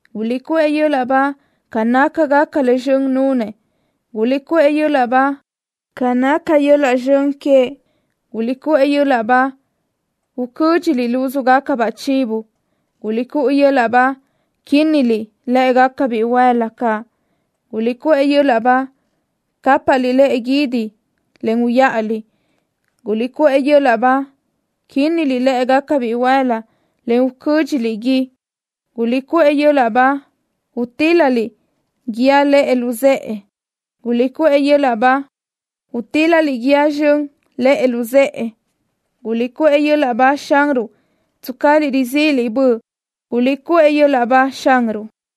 ¡Guliʼcuʼë yöl-laʼ ba ca nácagaca le zxön nunëʼ! ¡Guliʼcuʼë yöl-laʼ ba ca naca yöl-laʼ zxön queëʼ! ¡Guliʼcuʼë yöl-laʼ ba, ucö́dxiliʼ lúzugacabaʼ chivo! ¡Guliʼcuʼë yöl-laʼ ba, quínniliʼ lë́ʼegaca bihuël-la caʼ! ¡Guliʼcuʼë yöl-laʼ ba, cápaʼliʼ lëʼe guídi, en uyaʼaliʼ! ¡Guliʼcuʼë yöl-laʼ ba, quínniliʼ lë́ʼegaca bihuël-la, en ucö́dxiliʼ gui! ¡Guliʼcuʼë yöl-laʼ ba, utíl-laliʼ guíë lëʼe luzë́ʼe! ¡Guliʼcuʼë yöl-laʼ ba, utíl-laliʼ guíë zxön lëʼe luzë́ʼe! ¡Guliʼcuʼë yöl-laʼ ba Xanruʼ, tscaliʼ rizíʼiliʼ böʼ! ¡Guliʼcuʼë yöl-laʼ ba Xanruʼ!